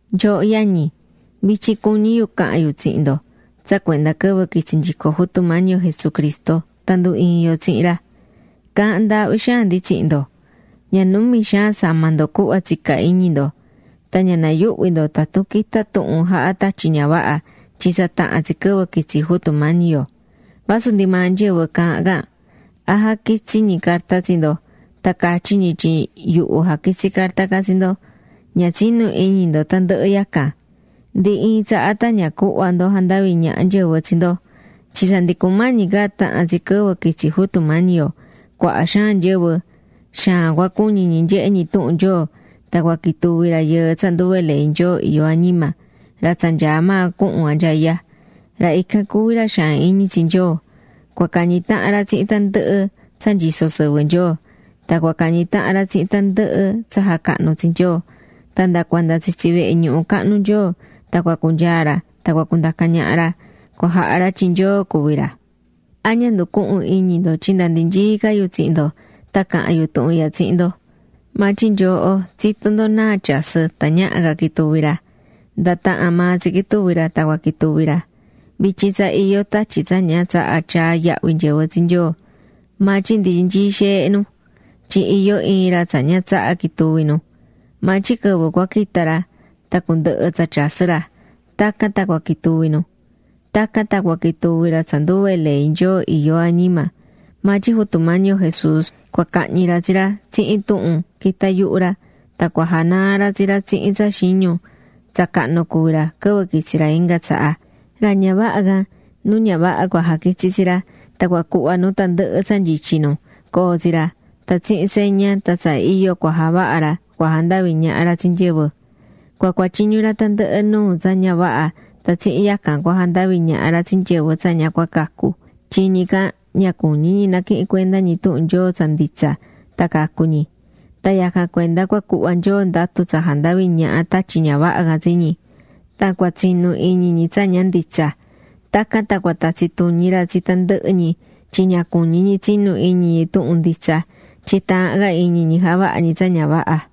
Nyooho yañi, vityin cuñí yu cahan yu tsihin ndo tsa cuenda quɨvɨ quitsi nyico Jutu Mañi yo Jesucristo tan ndu iin yo tsihin ra. Caahán ndaahvi xaan ndi tsihin ndo, ña numi xaan sama ndo cuhva tsicá iñi ndo. Tan ña nayuhvi ndo tatun quita tuhun jaha tatyi ña vaha tyin tsa taha̱n tsi quɨvɨ quitsi Jutu Mañi yo; vasu ndi maa nyɨvɨ caahán can, a jaquitsí ñi carta tsi ndo tan catyi ñi tyin yuhu jaquitsi̱ carta can tsi ndo. Ña tsinu iñi ndo tandɨhɨ yacan. Ndi iin tsaha tan ña cuhva ndo jandavi ñaha nyɨvɨ tsi ndo. Tyin tsa ndi cumañi ca tahan tsi quɨvɨ quitsi Jutu Mañi yo, cuaha xaan nyɨvɨ, xaan cua cuñi ñi nyehe ñi tuhun Nyoo, tan cua quituvi rayɨɨ tsa nduve ley Nyoo iyó añima, ra tsa nyaá maa cuhun anyaya. Ra ican cuví ra xaan iñi tsi Nyoo. Cua cañi tahan ra tsihin tandɨhɨ tsa nyisó sɨvɨ Nyoo; tan cua cañi tahan ra tsihin tandɨhɨ tsa jacahnú tsi Nyoo. Tan nda cuanda tsitsi vehe ñuhu cahnu Nyoo tan cua cunyaa ra tan cua cundaca ñaha ra, cua jaha ra tyin Nyoo cuví ra. ¿A ña nducuhún iñi ndo tyin nda ndi nyií ca yu tsihin ndo tan caha̱n yu tuhun ihya tsihin ndo? Maa tyin nyooho tsitó ndo náa tsa tyasɨ́ tan ñaha ca quituvi ra. Nda tahan maa tsi quituvi ra tan cua quituvi ra. Vityin tsa iyó tatyi tsa ña tsahá tyaá yahvi nyɨvɨ tsi Nyoo, maa tyin ndi nyií xeehe nu, tyin iyó iin ra tsa ña tsahá quituvi nu. Maa tyin quɨvɨ cua quita ra tan cundɨhɨ tsa tyasɨ́ ra, tacan tan cua quituvi nu. Tacan tan cua quituvi ra tsa nduve ley Nyoo iyó añima, maa tyin Jutu Mañi yo Jesús cua cahñi ra tsi ra tsihin tuhun quitá yuhu ra tan cua janaa ra tsi ra tsihin tsa xiñu tsa cahnu cuví ra quɨvɨ quitsi ra inga tsaha. Ra ña vaha can, nu ña vaha cua jaquitsi tsi ra. Tan cua cuhva nu tandɨhɨ tsa nyityi nu, coo tsi ra, tan tsihin seña tan tsa iyo cua javaha ra cua jandavi ñaha ra tsi nyɨvɨ. Cua cuatyiñu ra tandɨhɨ nuu tsa ña vaha tan tsihin yacan cua jandavi ñaha ra tsi nyɨvɨ tsa ña cua cacu. Tyin ñi can ña cuñí ñi naquihin cuenda ñi tuhun Nyoo tsa nditsa tan cacu ñi. Tan yacan cuenda cua cuhva Nyoo ndatu tsa jandavi ñaha tatyi ña vaha can tsi ñi. Tan cua tsinu iñi ñi tsa ña nditsa. Tacan tan cua tatsi tuñi ra tsi tandɨhɨ ñi tyin ña cuñí ñi tsinu iñi ñi tuhun nditsa. Tyin taahán ca iñi ñi javahá ñi tsa ña vaha.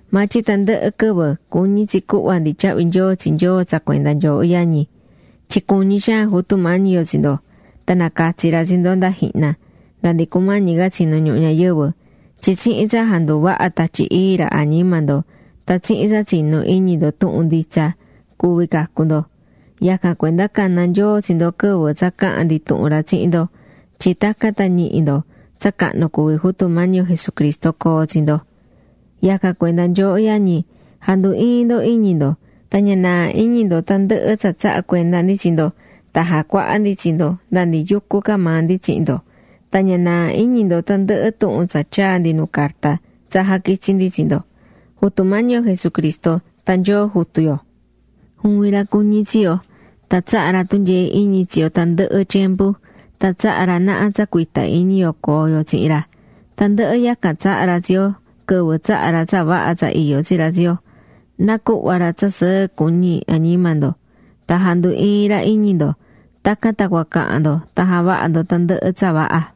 Maa tyin tandɨhɨ quɨvɨ cuñí tsi cuhva ndi tyahvi nyoo tsi Nyoo tsa cuenda nyooho yañi. Tyin cuñí xaan Jutu Mañi yo tsi ndo. Tan nacatsi̱ ra tsi ndo nda jihna, [nda ndi cumañi ca tsinu ñuhu ñayɨvɨ], tyin tsihin tsa janduvahá Tatyi Ii ra añima ndo tan tsihin tsa tsinú iñi ndo tuhun nditsa cuvi cacu ndo. Yacan cuenda cana̱ Nyoo tsi ndo quɨvɨ tsa caha̱n ndi tuhun ra tsihin ndo tyin tacan tan ñihi ndo tsa cahnu cuví Jutu Mañi yo Jesucristo coo tsi ndo. Yacan cuenda nyooho yañi, ja̱ndu iin ndo iñi ndo. Tan ña naa iñi ndo tandɨhɨ tsa tsaha̱ cuenda ndi tsi ndo tan jacuaha̱ ndi tsi ndo nda ndi yucú ca maa ndi tsihin ndo. Tan ña na̱a iñi ndo tandɨhɨ tuhun tsa tyaa̱ ndi nu carta tsa jaquitsi̱ ndi tsi ndo. Jutu Mañi yo Jesucristo tan Nyoo Jutu yo, juvin ra cuñí tsi yo; tan tsahá ra tunyee iñi tsi yo tandɨhɨ tyembu, tan tsahá ra naha tsa cuita iñi yo coo yo tsihin ra. Tandɨhɨ yacan tsahá ra tsi yo quɨvɨ tsaha̱ ra tsa vaha tsa iyó tsi ra tsi yo. Na cuhva ra tsa sɨɨ cuñi añima ndo. Tan jandu iin ra iñi ndo, tacan tan cua cahan ndo tan javaha ndo tandɨhɨ tsa vaha.